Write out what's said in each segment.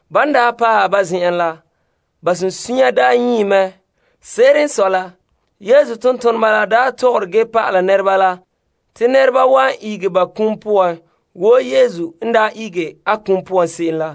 Ban daa paɛ ba zen'an la, ba sunsunya nyii mɛ. Se'ere n sɔe la, Yesu tontoneba la tɔgɔre ge pa'ala nɛreba la te nɛreba wan ihege ba kum poan wo Yesu n daa ihege a kum poan se'em la.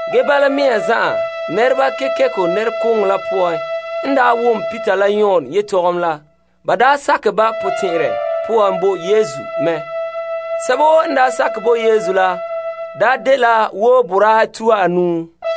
Ge bala mea zan'an nɛreba kekeko nɛrekooŋɔ la poan n wom Peter la Yon yetɔgom la, ba sakɛ ba potɛn'ɛrɛ poan bo Yesu mɛ. Sɛba woo n sakɛ bo Yesu la daa dela wo boraahe tuha anuu.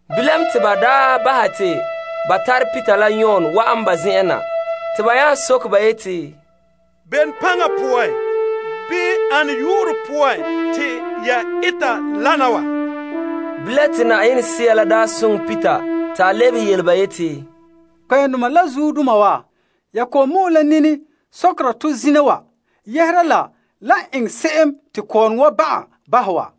Bilam te ba bahɛ te ba tare Peter la Yon wa'an ba zen'en na te ba nya soke ba yeti, Bene paŋa poan bii ana yu'urɛ poan te ya eta wana wa? Bilam te Yenɛ Sea soŋɛ Peter te a lebehe yele ba yeti, Kpɛ'ɛndoma la zuodoma wa, ya kɔ'ɔn mɔ'ɛn nini sɔkera tɔ zina wa yɛhera la la eŋɛ se'em te kɔɔrɔŋɔ wa ban'an bahɛ wa.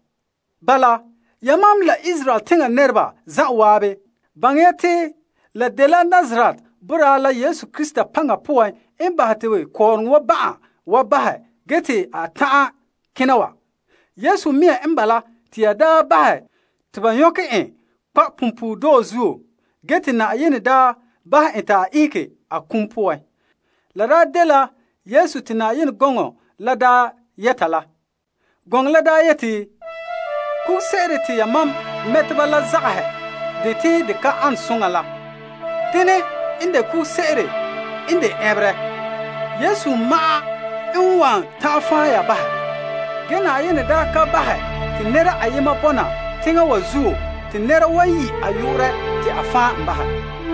Bala, yamam la Israel teŋa nɛreba zan'an, baŋɛ ya te la dela Nazaret boraa la Yesu Krista paŋa poan n bahɛ te kɔɔrɔŋɔ wa ban'an wa bahɛ ge te a ta'an kena wa. Yesu mea n bala te ya daa bahɛ te ba nyɔkɛ en kpa' punpuuredɔɔ zuo, ge te Yenɛ daa bahɛ en te a ihege a kum poan. La daa dela Yesu te Yenɛ gɔŋɔ la daa yɛta yeti, Kuguse'ere te mɛteba zagahɛ la, denɛ en ta dɛna ɛnberɛ kugure. Yesu ma'an n wan ta'an fan' ya bahɛ ge Yenɛ daa ka bahɛ te nɛra ayema bɔna teŋa wa zuo te nɛra wan yi' a yu'urɛ te a fan' en bahɛ.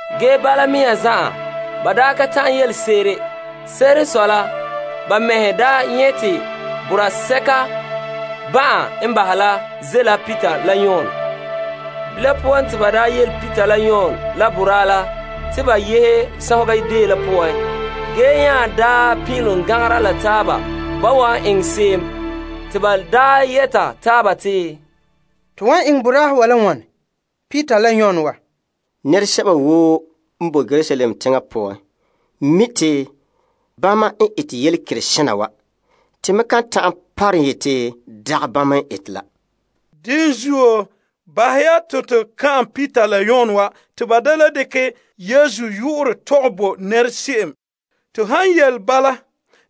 Ge bala mea zan'an ba ka ta'an yelese'ere, ban nyɛ' te boraa sɛka ban'an n bahɛ la ze'a la Peter la Yon la zuo. Bilam poan te ba yele Peter la Yon la boraa la te ba yehe Yetɔgom Tɔgɔrɔba deo la poan ge nya pin'ilom gan'angera la taaba ba wan eŋɛ se'em. Te ba yɛta taaba te, To wan eŋɛ Peter la Yon la boraahe wa la wane? Nɛresɛba woo n boe Yerusalem teŋa poan mi' te bama n ete yelekerega kana wa. To me kan ta'an parom yete dagɛ bama n ete la. Dene zuo, bahɛ ya te to ka'an Peter la Yon wa te ba da le yɛ'ɛha dekɛ Yesu yu'urɛ tɔgɛ bo nɛra se'em. To han yele bala,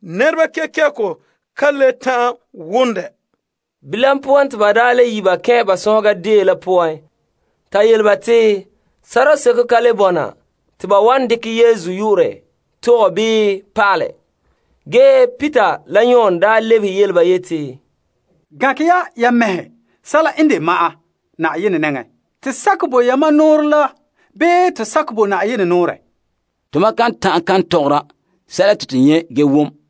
nɛreba kekeko ka le ta'an wom dɛ. Bilam poan te ba le yi' ba kɛn' ba sɔnhega deo la poan ta yele ba te sorɔseko ka le bɔna te ba wan dekɛ Yesu yu'urɛ tɔgɛ bii pa'alɛ. Ge Peter la Yon lebehe ba yeti, Gankɛ ya ya mɛhe sɛla n de ma'an Yenɛ nɛŋa. Te sakɛ bo yamam nɔɔrɛ la bii te sakɛ bo Yenɛ nɔɔrɛ? Tomam kan ta'an kan tɔgɔra sɛla te to nyɛ' ge wom.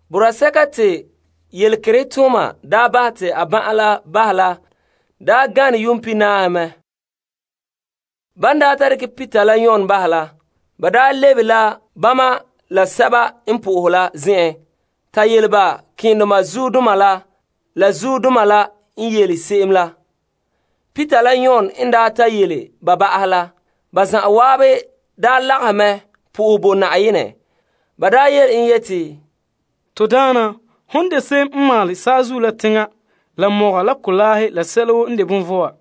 Boraa sɛka te yelekerehe tooma bahɛ te a ban'an la bahɛ la gane yuun pihinaahe mɛ. Ban ta bahɛ te Peter la Yon kula, ba lebe la bama la sɛba n po'ohe la zen'en ta yele ba malema keendoma la la zuodoma la n yele se'em la. Peter la Yon n ta yele ba bahɛ la, ba zan'an lagahɛ mɛ sohɛ bo Na'ayenɛ. Ba yele en yeti, To Daana Na'ayenɛ, hon de se'em n maalɛ saazuo la teŋa la mɔga la kolaahe la sɛla woo n de bonvɔa.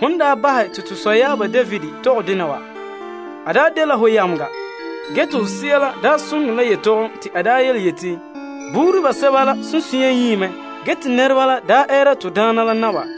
Hon daa bahɛ te to sɔyaaba David tɔgɛ dena wa. A daa dela hon yameŋa ge te ho Sea la daa soŋɛ en la yetɔgom te a daa yeti, Bene n sɔe te teŋhe pan'ahɛ ba mɛhe, te nɛreba wa gaara yo wa?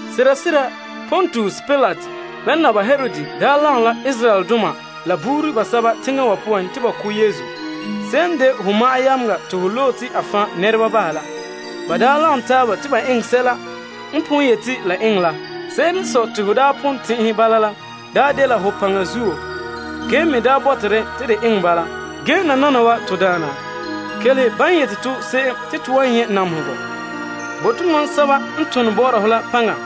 Sera sera Pontius Pilate la Naba Herod daa lagom la Israeldoma la buuri basɛba teŋa wa poan te ba ko' Yesu se'em n de ho fa'a bia te ho loe te a fan' nɛreba bahɛ la. Ba daa lagom taaba te ba eŋɛ sɛla n pon yete la eŋɛ la. Se'ere n sɔe te ho daa pon tɛn'ɛhɛ bala la daa dela ho paŋa zuo ge me daa bɔta dɛ te de eŋɛ bala. Ge nananawa to Daana, kelehe ban yele to se'em. Bo' tomam sɛba n ton bɔ'ɔra ho la paŋa.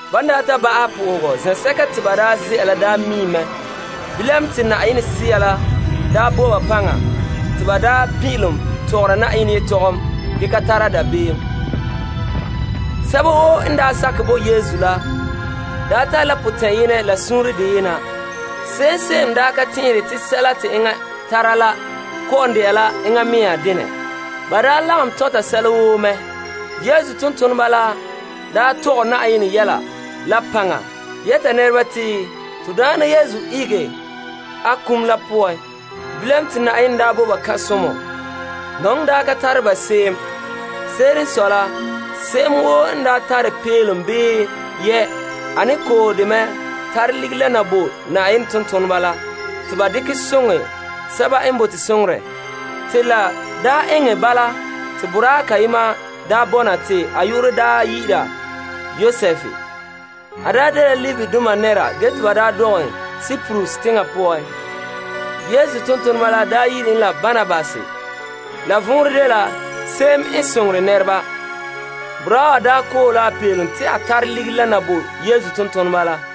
Ban daa ta ba'ahɛ sohoga zen'sɛka te ba daa ze'a la daa miim mɛ. Bilam, te Yenɛ Sea la daa bo ba paŋa te ba daa pin'ilom tɔgɔra Yenɛ yetɔgom ge ka tara dabeem. Sɛba woo n sakɛ bo Yesu la tare la potɛn'yemɔ la suunre deyena. Se'em ka tɛn'ɛhere te sɛla te enŋa tara la kɔ'ɔn de'a la a mea denɛ. Ba lagom tɔnta sɛla woo mɛ. Yesu tontoneba la tɔgɛ Yenɛ yɛla la paŋa yɛta nɛreba te to Na'ayenɛ Yesu ihege a kum la poan. Bilam te Yenɛ bo ba kan'somɔ. Nɔŋɔ ka tare ba se'em. Se'ere n sɔe la se'em woo n tare peelom bii yiya, a ne koohe dɛ mɛ tare ligiri la na bo Yenɛ tontoneba la te ba dekɛ soŋɛ sɛba n bote soŋorɛ. Te la eŋɛ bala te boraa kayema bɔna te a yu'urɛ dɛna Yosef. A dela Levidoma nɛra ge te ba dɔgɛ en Kiprus teŋa poan. Yesu tontoneba la daa yi'ira en la Barnabas. La vɔnrɛ dela se'em n soŋore nɛreba. Boraa wa koohe la a peelom te a tare ligiri la na bo Yesu tontoneba la.